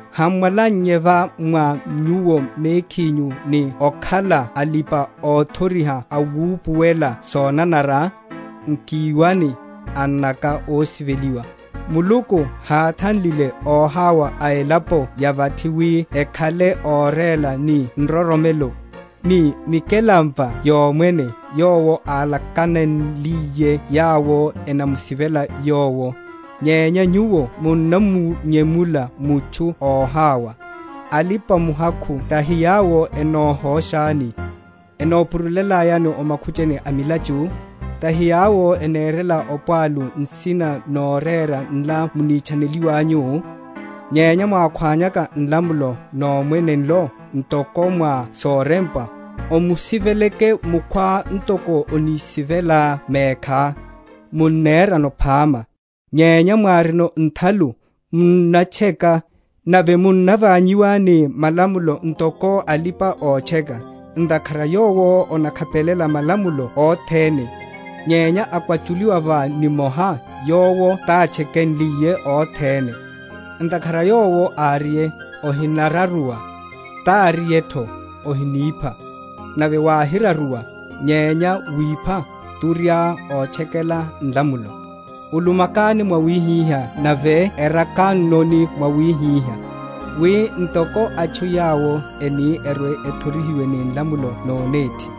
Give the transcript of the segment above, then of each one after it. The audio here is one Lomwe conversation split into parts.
ham’mwalannye va mwa nyuwo mekhinyu, ni okhala alipa‐othoriha awupuwelela sonanara? Nkiwani, annaka ósiveliwa; Muluku háthanlile óhawa a elapo ya vathi wi ekhale óréla ni nroromelo, ni mikelampa yomwene yowo álakanenliye yawo enamusivela Yowo? Nyenya nyuwo munnamunyemula mutchu óhawa. Alipa‐muhakhu tahi yawo enohóshani, enopururyelani o makhuchani a milachu? Tahi yawo enerela opwalu nsina norera nla munitchaniwanyuno? Nyenya mwákhwányaka nlamulo nomwene nlo, ntoko mwa sorempwa, Omusiveleke mukhwá ntoko onisivelelá mekhá, munnerano phama: nyenya mwárino nthalu, munnatcheka, nave munnaványiwa ni malamulo ntoko alipa‐otcheka. Ntakhara yowo onakhapelela malamulo othene, nyenya akwachuliwa va nimoha, yowo tatchekenliye othene. Ntakhara Yowo áriye, Ohinararuwa, táriyetho, Ohinipha. Nave wáhiraruwa, nyenya wipha, turiá ótchekela nlamulo. Ulumakani mwawihihá, nave erakannoni mwawihihá, wi ntoko atchu yawo eni erwe‐ethorihiwe ni nlamulo nonéthi.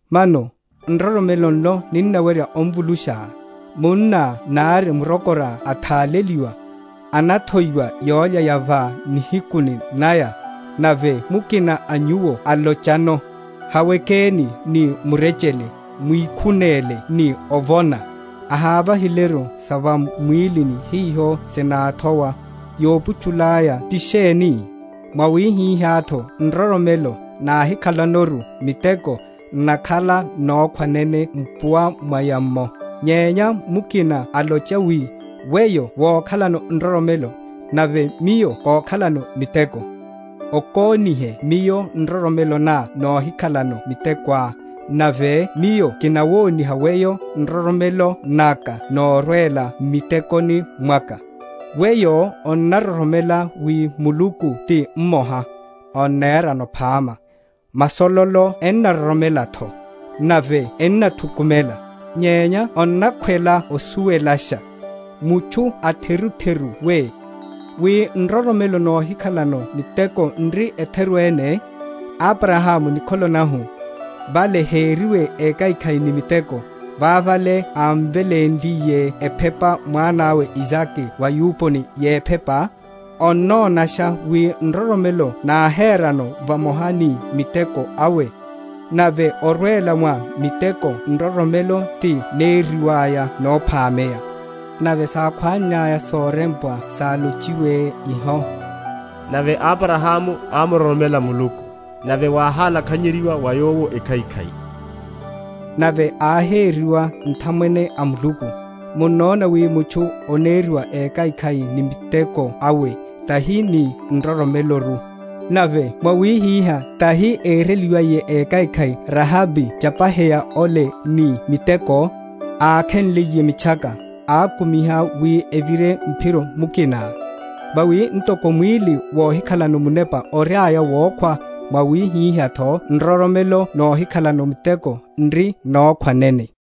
Mano nroromelo nlo ninnawerya omvulusha? Munna nari murokora atháleliwa, anathoiwa yólya ya va nihiku naya, nave mukina a nyuwo alochano, Hawekeni ni murechele, mwikhunéle ni ovona; ahávahileru sa va mwílini hiho sináthowa; yophuchula aya ti sheni? Mwawihihátho nroromelo, náhikha?-?lanoru miteko, n’nakhala nokhwa nene mpuwa mwaya’mmo. Nyenya mukina alocha wi, Weyo wókhalano nroromelo, nave miyo kókhalano miteko; okónihe miyo nroromelo ná nóhikhalano mitekoá, nave miyo kinawoniha weyo nroromelo naka norwela m’mitekoni mwaka. Weyo onnaroromela wi Muluku ti mmoha; onnerano phama; masololo ennaroromelatho, nave ennathukumela. Nyenya onnakhwela osuwelasha, mutchu atherutheru we, wi nroromelo nóhikhalano miteko n’ri etheru ene? Abrahamu nikholo nahu, vale hériwe ékhaikhai ni miteko, vavale ámvelénliye ephepa mwanawe Isake va’yuponi yephepa? Onnonasha wi nroromelo náherano vamoha ni miteko awe, nave orwela mwa miteko nroromelo ti nériwaya nophameya; nave sákhwannaya sorempwa sálochiwe iho, Nave Abrahamu ámuroromela Muluku, nave wáhalakhanyeryiwa wa yowo ekhaikhai; nave áheriwa nthamwene a Muluku. Munnona wi mutchu oneriwa ékhaikhai ni miteko awe, tahi ni nroromeloru. Nave mwawihihá tahi éreliwiye ékhaikhai Rahabi chapaheya ole ni miteko, ákhenliye mitchaka, akumiha wi evire mphiro mukina? Vawi ntoko mwíli wóhikhalano munepa oriaya wokhwa, mwawihihátho nroromelo nóhikhalano miteko n’ri nokhwa nene.